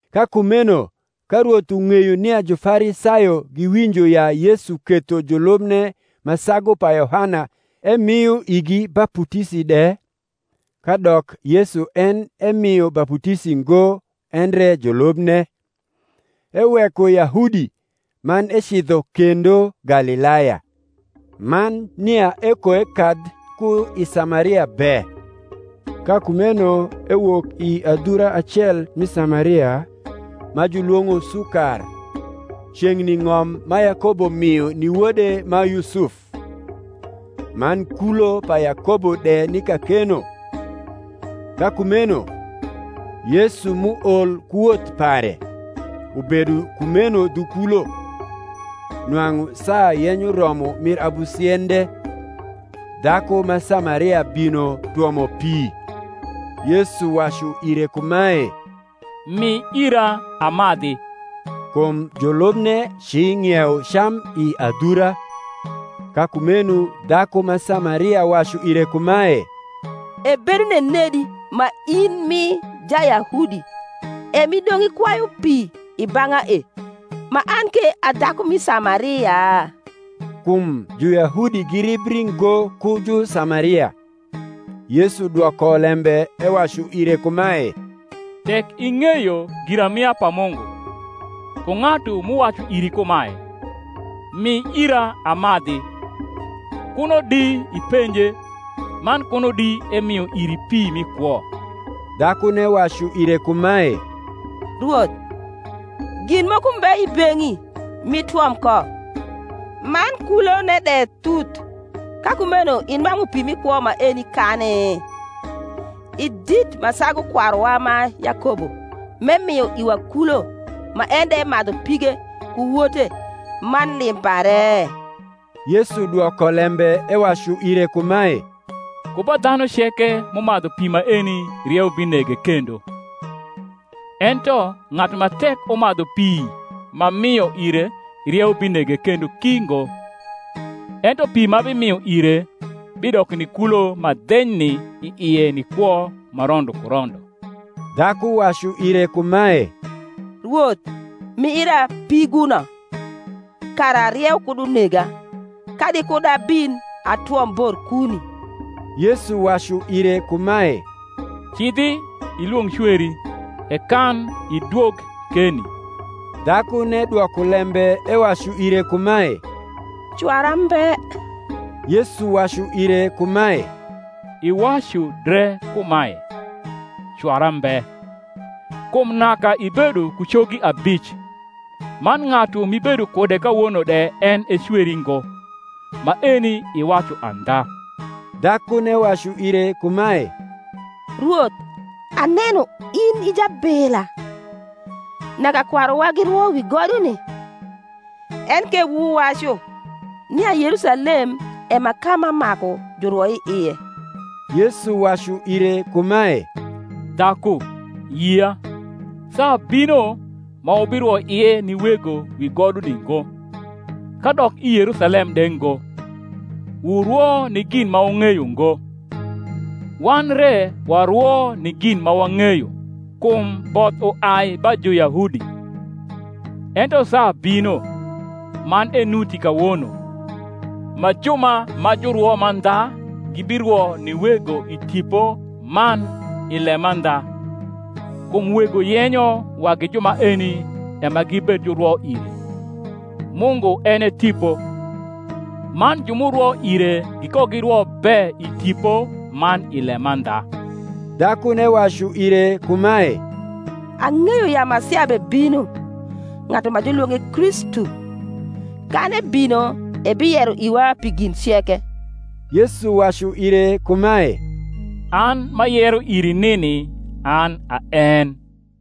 Ka kumeno ka Rwoth ung’eyo nia Jufarisayo giwinjo ya Yesu ketho julubne ma sagu pa Yohana emio igi baputisi de. (kadok Yesu en emio baputisi ngo, endre julubne), eweko Yahudi, man ecidho kendo Galilaya. Man nia ekoekadh ku i Samaria be. Ka kumeno ewok i adhura acel mi Samaria, ma julwong’o Sukar, ceng’ni ng’om ma Yakobo mio ni wode ma Yusuf: man kulo pa Yakobo de ni kakeno. Ka kumeno, Yesu m’uol ku woth pare, ubedo kumeno dhu kulo. Nwang’u saa yenyo romo mir abusiende. Dhaku ma Samaria bino twomo pi: Yesu wacu ire kumae, Mi ira amadhi. Kum julubne ci ng’iewo cam i adhura. Ka kumeno dhaku ma Samaria wacu ire kumae, Ebedo nenedi ma in m’i Jayahudi, e m’idong’ ikwayu pi i bang’a e, ma an ke a dhaku mi Samaria? (Kum Juyahudi giribri ngo ku Jusamaria). Yesu dwoko lembe ewacu ire kumae, Tek ing’eyo giramia pa Mungu, ku ng’atu m’uwacu iri kumae, Mi ira amadhi; kuno di ipenje, man kuno di emio iri pi mi kwo. Dhakune wacu ire kumae, Rwoth, gin moko mbe i beng’i m’itwom ko, man kulone de thuth: ka kumeno inwang’u pi mi kwo maeni kani? I dit ma sagu kwaruwa ma Yakobo, m’emio iwa kulo, ma en de emadhu pige, ku wote, man lim pare? Yesu dwoko lembe ewacu ire kumae, Ku ba dhanu ceke m’umadhu pi maeni rieu binege kendo: ento ng’atu ma tek umadhu pi m’amio ire rieu binege kendo ki ngo; ento pi m’abimio ire bidoko ni kulo ma dhenyni i ie ni kwo ma rondo ku rondo. Dhaku wacu ire kumae, Rwoth, mi ira piguno, kara rieu kud unega, kadi kud abin atwom bor kuni. Yesu wacu ire kumae, Cidhi, ilwong’ cweri, e kan idwog keni. Dhakune dwoko lembe ewacu ire kumae, Cwara mbe. Yesu wacu ire kumae, Iwacu dre kumae, Cwara mbe: kum naka ibedo ku cogi abic; man ng’atu m’ibedo kude kawono de en e cweri ngo: maeni iwacu andha. Dhakune wacu ire kumae, Rwoth, aneno in i jabila. Naka kwaruwa girwo wi goduni; enke wuwacu, nia Yerusalem e ma ka ma maku jurwo i ie. Yesu wacu ire kumae, Dhaku, yia, saa bino, ma wubirwo ie ni Wego wi goduni ngo, kadok i Yerusalem de ngo. Wurwo ni gin ma wung’eyo ngo: wan re warwo ni gin ma wang’eyo; kum both uai ba Juyahudi. Ento saa bino, man enuti kawono, ma ju ma jurwo mandha gibirwo ni Wego i tipo man i lemandha: kum Wego yenyo wagi ju maeni e ma gibed jurwo ire. Mungu en e Tipo: man ju m’urwo ire gikogirwo be i tipo man i lemandha. Dhakune wacu ire kumae, Ang’eyo ya Masia bebino (ng’atu ma julwong’e Kristu): kan ebino, ebiyero iwa pi gin ceke. Yesu wacu ire kumae, An m’ayero iri nini an a en.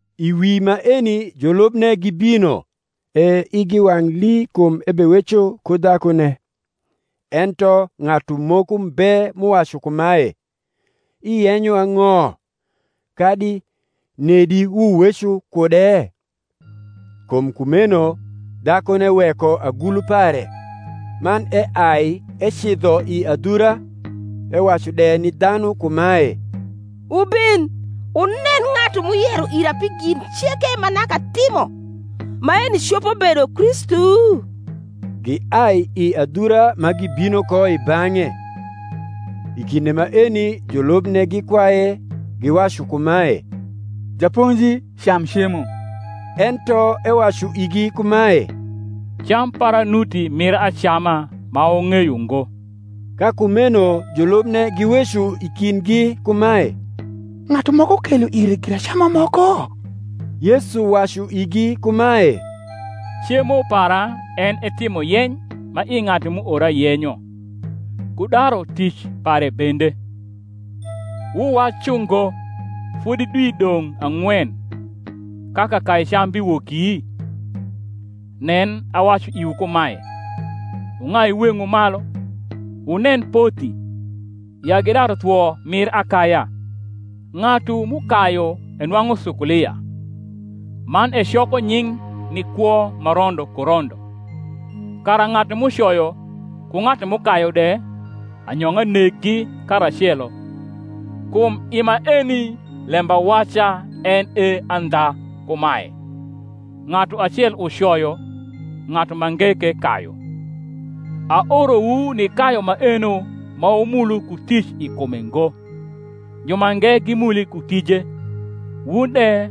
I wi maeni julubne gibino; e igi wang’ lii kum ebeweco ku dhakune; ento ng’atu moko mbe m’uwacu kumae, Iyenyo ang’o? kadi, Nedi wuweco kude? Kum kumeno dhakune weko agulu pare, man eai ecidho i adhura, ewacu de ni dhanu kumae, Wubin, wunen ng’atu m’uyero ira pi gin ceke ma naka atimo: maeni copo bedo Kristu? Giai i adhura ma gibino ko i bang’e. I kinde maeni julubne gikwaye, giwacu kumae, Japonji, cam cemo. Ento ewacu igi kumae, Cam para nuti mir acama ma wung’eyo ngo. Ka kumeno julubne giweco i kindgi kumae, Ng’atu moko kelo ire giracama moko? Yesu wacu igi kumae, Cemo para en e timo yeny ma i ng’atu m’uora yenyo, ku daru tic pare bende. Wuwacu ngo, Fodi dwi dong’ ang’wen, ka kakaicam biwoki? nen, awacu iwu kumae, Wung’ai weng’wu malu, wunen pothi, ya gidaru thwo mir akaya. Ng’atu m’ukayu enwang’u sukulia, man ecoko nying’ ni kwo ma rondo ku rondo; kara ng’atu m’ucoyo ku ng’atu m’ukayu de anyong’a neggi karacelo. Kum i maeni lembawaca en e andha kumae, Ng’atu acel ucoyo, ng’atu mange ke kayu. Aorowu nikayu maeno ma wumulu ku tic i kume ngo: jumange gimuli ku tije, wun de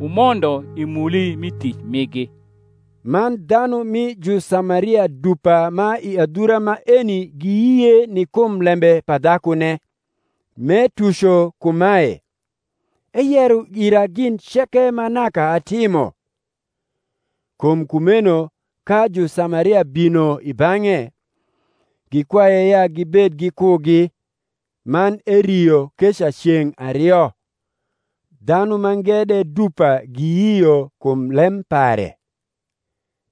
wumondo i muli mi tic migi. Man dhanu mi Jusamaria dupa ma i adhura maeni giyie ni kum lembe pa dhakune, m’etuco kumae, Eyero ira gin ceke ma naka atimo. Kum kumeno ka Jusamaria bino i bang’e, gikwaye ya gibed gikugi: man erio keca ceng’ ario. Dhanu mange de dupa giyio kum lem pare;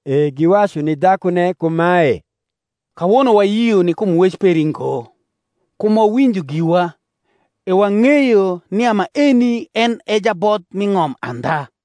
e giwacu ni dhakune kumae, Kawono wayio ni kum wec peri ngo: kum wawinjo giwa, e wang’eyo nia maeni en e Jabodh mi ng’om andha.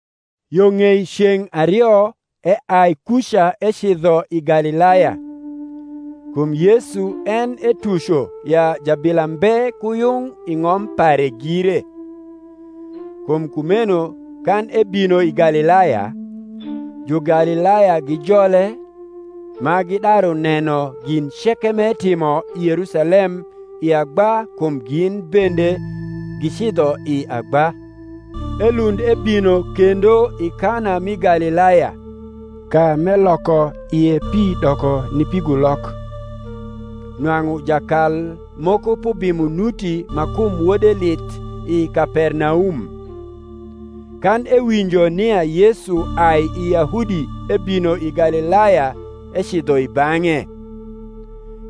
Yo ng’ei ceng’ ario eai kuca ecidho i Galilaya. Kum Yesu en etuco ya jabila mbe ku yung i ng’om pare gire. Kum kumeno kan ebino i Galilaya, Jugalilaya gijole, ma gidaru neno gin ceke m’etimo i Yerusalem i agba kum gin bende gicidho i agba. Elund ebino kendo i Kana mi Galilaya, ka m’eloko ie pi doko ni pigulok. Nwang’u jakal moko p’ubimo nuti ma kum wode lith i Kapernaum. Kan ewinjo nia Yesu ai iYahudi ebino i Galilaya ecidho i bang’e,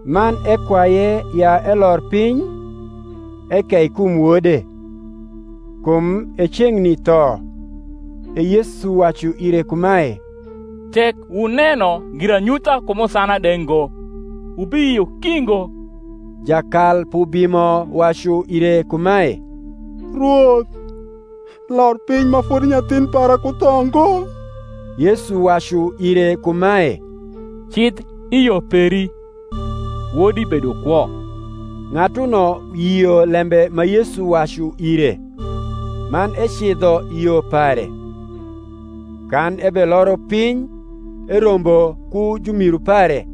man ekwaye ya elor piny, ekei kum wode; kum e ceng’ni tho. E Yesu wacu ire kumae, Tek wuneno giranyutha ku musana de ngo, wubiyio ki ngo. Jakal p’ubimo wacu ire kumae, Rwoth, lor piny ma fodi nyathin para ku tho ngo. Yesu wacu ire kumae, Cidh i yo peri; wodi bedo kwo. Ng’atuno yio lembe ma Yesu wacu ire, man ecidho i yo pare. Kan ebeloro piny, erombo ku jumiru pare,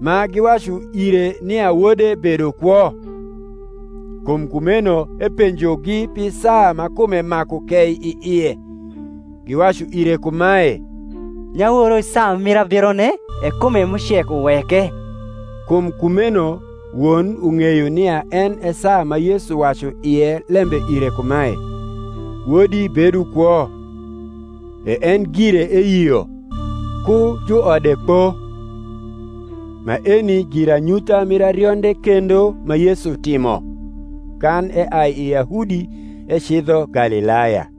ma giwacu ire nia wode bedo kwo. Kum kumeno epenjogi pi saa ma kume maku kei i ie. Giwacu ire kumae, Nyaworo i saa mir abirone e kume m’ucek uweke. Kum kumeno won ung’eyo nia en e saa ma Yesu wacu ie lembe ire kumae, Wodi bedo kwo: e en gire eyio, ku juode kpo. Maeni giranyutha mir arionde kendo ma Yesu timo, kan eai i Yahudi ecidho Galilaya.